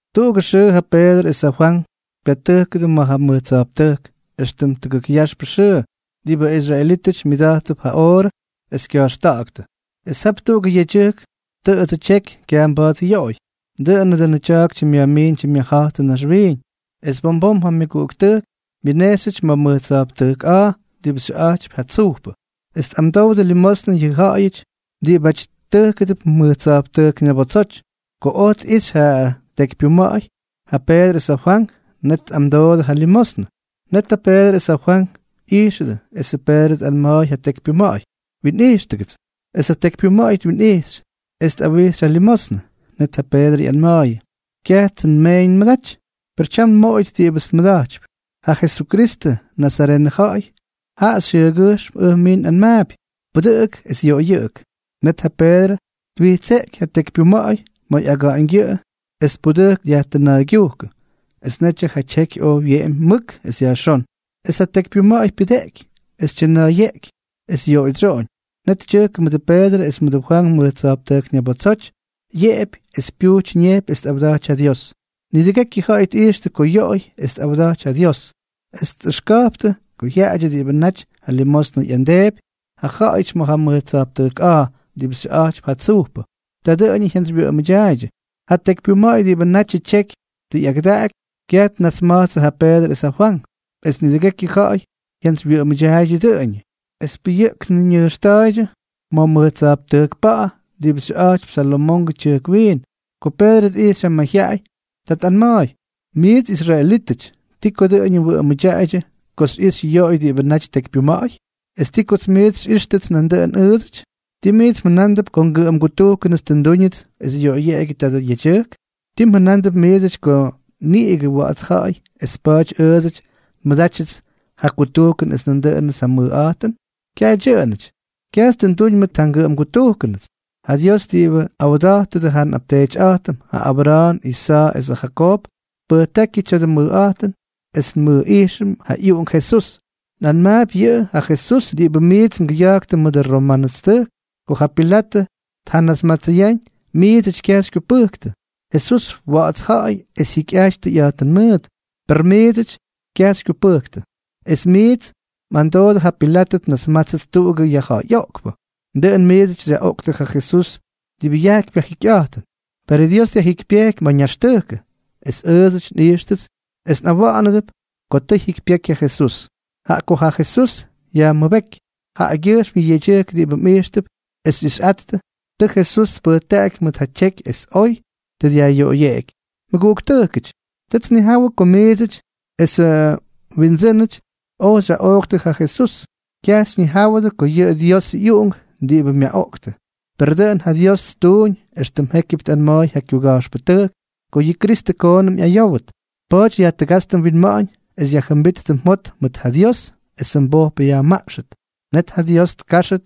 Tuꞌugʉ xʉʉ ja Peedrʉ es ja Fwank pyatʉjkʉdʉ ma̱ ja mʉj tsa̱jptʉjk éxtʉm tʉgʉk yaxp xʉʉ, diꞌibʉ israelítʉty myʉda̱jttʉp ja oorʉ es kya̱jxta̱ꞌa̱ktʉ. Es jap tuꞌugʉ yedyʉjk tʉꞌʉdsʉ tyeky, kyaj mba̱a̱t yoꞌoy. Dʉꞌʉnʉ dʉnʉ tya̱a̱k tyimꞌyajmiin tyimꞌyajja̱jtʉ naxwiiñ. Es bom bom ja myʉguꞌuktʉjk myʉnejxyʉty ma̱ mʉj tsa̱jptʉjk a̱a̱ diꞌibʉ xyʉꞌa̱jtypy Ja Tsujpʉ, es tꞌamdowdʉ limosnʉ yʉ ja̱ꞌa̱yʉty diꞌibáty tʉjkʉdʉp mʉj tsa̱jptʉjk ñabotsoty. Ko oj tꞌixy ja tekypyuma̱ꞌa̱y ja Peedrʉ es ja Fwank, net tꞌamdoodʉ ja limosnʉ. Net ja Peedrʉ es ja Fwank ꞌyijxʉdʉ, esʉ Peedrʉ tꞌanma̱a̱y ja tekypyuma̱ꞌa̱y: —Winꞌijxtʉgʉts. Es ja tekypyuma̱ꞌa̱y twinꞌijxy, es tꞌawijxy ja limosnʉ. Net ja Peedrʉ ꞌyanma̱a̱yʉ: —Kyajtsʉ nmeeñ nmʉdaty, per tyam nmoꞌoyʉt diꞌibʉts nmʉda̱jtypy. Ja Jesukristʉ, nazarenʉ ja̱ꞌa̱y, jaꞌa xyʉʉgyʉjxm ʉj mij nꞌanmaapy: Pʉdʉꞌʉk es yoꞌoyʉꞌʉk. Net ja Peedrʉ twijtseꞌky ja tekypyuma̱ꞌa̱y ma̱ ꞌyaga̱ꞌa̱ñgyʉꞌʉ es tpudʉjkʉ dyajtʉna̱a̱ygyujkʉ, es netyʉ ja tyeky oj wyeꞌemy mʉk es yajxón. Es ja tekypyuma̱ꞌa̱y pyujteꞌky es tyʉna̱a̱yeꞌky es yoꞌoydsyoꞌoñ. Net tyʉjkʉ mʉdʉ Peedrʉ es mʉdʉ Fwank mʉj tsa̱jptʉjk ñabotsoty, yeꞌepy es pyuty ñepy es tꞌawdaty ja Dios. Nidʉgekyʉ ja̱ꞌa̱y tꞌijxtʉ ko yoꞌoy es tꞌawdaty ja Dios, es tꞌʉxka̱jptʉ ko jyaꞌadyʉ diꞌibʉ natyʉ limosnʉ ꞌyamdeepy ja ja̱ꞌa̱yʉty ma̱ ja mʉj tsa̱jptʉjk a̱a̱ diꞌibʉ xyʉꞌa̱jtypy Ja Tsujpʉ. Ta dʉꞌʉñʉ jyantsywyʉꞌʉmʉdyaaydyʉ. Ja tekypyuma̱ꞌa̱y diꞌibʉ natyʉ tyeky tʉ ꞌyakʉdaꞌaky, kyaj tnasmatsʉ ja Peedrʉ es ja Fwank. Es nidʉgekyʉ ja̱ꞌa̱y jyantsywyʉꞌʉmʉdyaaydyʉ dʉꞌʉñʉ, es pʉyʉꞌkn ñʉjxta̱a̱ydyʉ ma̱ mʉj tsa̱jptʉjk pa̱ꞌa̱ diꞌibʉ xyʉꞌa̱jtypy Salomongʉ Tyʉjk Wiin. Ko Peedrʉ tꞌijxy ja mayjyaꞌay, ta tꞌanma̱a̱y: —Miits israelítʉty, ¿ti ko dʉꞌʉñʉ mwʉꞌʉmʉdyaꞌaydyʉ ko xyꞌixy yoꞌoy diꞌibʉ naty tekypyuma̱ꞌa̱y? ¿Es ti ko miits xyꞌíxtʉts nandʉꞌʉn ʉʉdsʉty? ¿Tii miits mjʉnándʉp ko ngʉꞌʉmgutujkʉnʉts tʉ ndúñʉts es yoꞌoyeꞌegyʉ tadʉ yedyʉjk? ¿Ti mjʉna̱a̱mp miidsʉty ko niꞌigʉ wa̱ꞌa̱ts ja̱ꞌa̱y es pa̱a̱ty ʉʉdsʉty nmʉdátyʉts ja kutujkʉn es ndúnʉdʉts ja mʉjꞌa̱jtʉn? ¡Kyaj dyʉꞌʉnʉty! Kyajts tʉ nduñ mʉt ja ngʉꞌʉmgutujkʉnʉts. Ja Dios diꞌibʉ awda̱jtʉdʉ ja nꞌapteetyꞌa̱jtʉm, ja Abra̱a̱n, Isa̱a̱ esʉ Jakoob, tpʉjtákyʉ tya̱dʉ mʉjꞌa̱jtʉn es nmʉjꞌijxʉm ja ꞌyUꞌunk Jesús. Nꞌanmaapy yʉꞌʉ ja Jesús diꞌibʉ miits mgʉya̱jktʉ mʉt ja romanʉstʉjk. Ko ja Pilatʉ tjanasmatsʉyáñ, miidsʉty kyaj xykyupʉjktʉ. Jesús, wa̱ꞌa̱ts ja̱ꞌa̱y es jikyꞌajty tʉyꞌa̱jtʉn mʉʉt, per miidsʉty kyaj xykyupʉjktʉ. Es miits mꞌamdoodʉ ja Pilatʉ tnasmátsʉt tuꞌugʉ yajja̱ꞌa̱yꞌoꞌkpʉ. Dʉꞌʉn miits xyaꞌoꞌktʉ ja Jesús diꞌibʉ yajkypy ja jikyꞌa̱jtʉn. Perʉ Dios dyajjikypyejky ma̱ ñaxtʉjkʉ. Es ʉʉdsʉty nꞌijxtʉts es nꞌawa̱ꞌa̱nʉdʉp ko tʉ jyikypyeky ja Jesús. Jaꞌa ko ja Jesús yajmʉbéky, jaꞌagyʉjxm yʉ yedyʉjk diꞌibʉ mꞌijxtʉp es xyꞌixyꞌattʉ, tʉ Jesús tpʉjtaꞌaky mʉk ja tyeky es oy tʉ dyajꞌyoꞌoyeꞌeky. ’Mʉguꞌuktʉjkʉty, tʉts nnijawʉ ko miidsʉty esʉ mwindsʉ́nʉty oj xyaꞌooktʉ ja Jesús, kyaj xyñijáwʉdʉ ko yʉꞌʉ Diosʉ ꞌyUꞌunk diꞌibʉ myaꞌoꞌktʉ. Per dʉꞌʉn ja Dios ttuuñ éxtʉm jékyʉp tꞌanma̱a̱y ja kyuga̱jxpʉtʉjk ko yʉ Kristʉ koonʉm ꞌyayówʉt. Pa̱a̱ty yajtʉgátstʉ mwinma̱ꞌa̱ñ es yajjʉmbíttʉ mjot mʉt ja Dios esʉ mbojpʉ yajmaꞌxʉt, net ja Dios tkáxʉt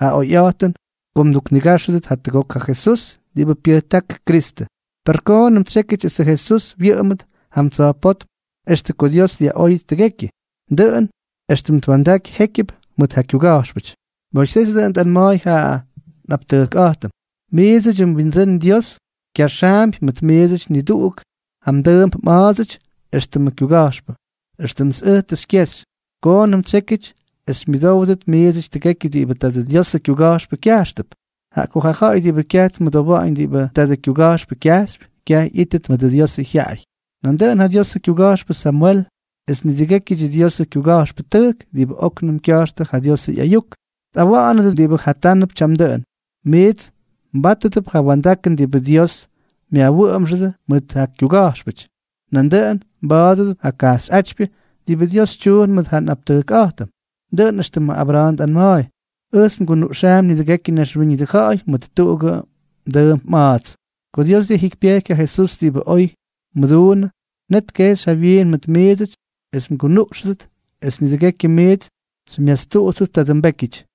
ja oyꞌa̱jtʉn ko mduknigáxʉdʉt jatʉgok ja Jesús diꞌibʉ pyʉjták Kristʉ. Per koonʉm tsyékyʉty esʉ Jesús wyʉꞌʉmʉt jam tsa̱jpótm extʉ ko Dios dyaꞌóyʉt tʉgekyʉ, dʉꞌʉn éxtʉm twa̱ndaky jékyʉp mʉt ja kyuga̱jxpʉty. ’Moisés dʉꞌʉn tꞌanma̱a̱y ja nꞌaptʉjkꞌa̱jtʉm: “Miidsʉdyʉ mWindsʉ́n Dios kyaxaampy mʉt miidsʉty niduꞌuk ja mdʉʉmp mꞌa̱a̱dsʉty éxtʉmʉ kyuga̱jxpʉ, éxtʉmts ʉj tʉ xykyexy. Koonʉm tsyékyʉty es xymyʉdówdʉt miidsʉty tʉgekyʉ diꞌibʉ tadʉ Diosʉ kyuga̱jxpʉ kya̱jxtʉp. Jaꞌa ko ja ja̱ꞌa̱y diꞌibʉ kyaj tmʉdowa̱ꞌa̱ñ diꞌibʉ tadʉ kyuga̱jxpʉ kyajxypy, kyaj ꞌyíttʉt mʉdʉ Diosʉ jyaꞌay.” ’Nandʉꞌʉn ja Diosʉ kyuga̱jxpʉ Samwel es nidʉgékyʉdyʉ Diosʉ kyuga̱jxpʉtʉjk diꞌibʉ óknʉm kya̱jxtʉ ja Diosʉ ꞌyayuk, tꞌawa̱ꞌa̱nʉdʉ diꞌibʉ jatánʉp tyam dʉꞌʉn. Miits mbátʉdʉp ja wa̱ndakʉn diꞌibʉ Dios myajwʉꞌʉmxʉdʉ mʉt ja kyuga̱jxpʉty, nandʉꞌʉn mbátʉdʉp ja kajxyꞌátypyʉ diꞌibʉ Dios tyuun mʉʉt ja nꞌaptʉjkꞌa̱jtʉm. Dʉꞌʉn éxtʉmʉ Abra̱a̱n tꞌanma̱a̱y: “Ʉjts ngunuꞌxaampy nidʉgekyʉ naxwíñʉdʉ ja̱ꞌa̱y mʉt tuꞌugʉ mdʉʉmp mꞌa̱a̱ts.” ’Ko Dios dyajjikypyejky ja Jesús diꞌibʉ oy mʉduunʉ, net tkejxy jawyiin mʉt miidsʉty es mgunuꞌxʉdʉt es nidʉgekyʉ miits xymyastuꞌuttʉt tadʉ mbékyʉty.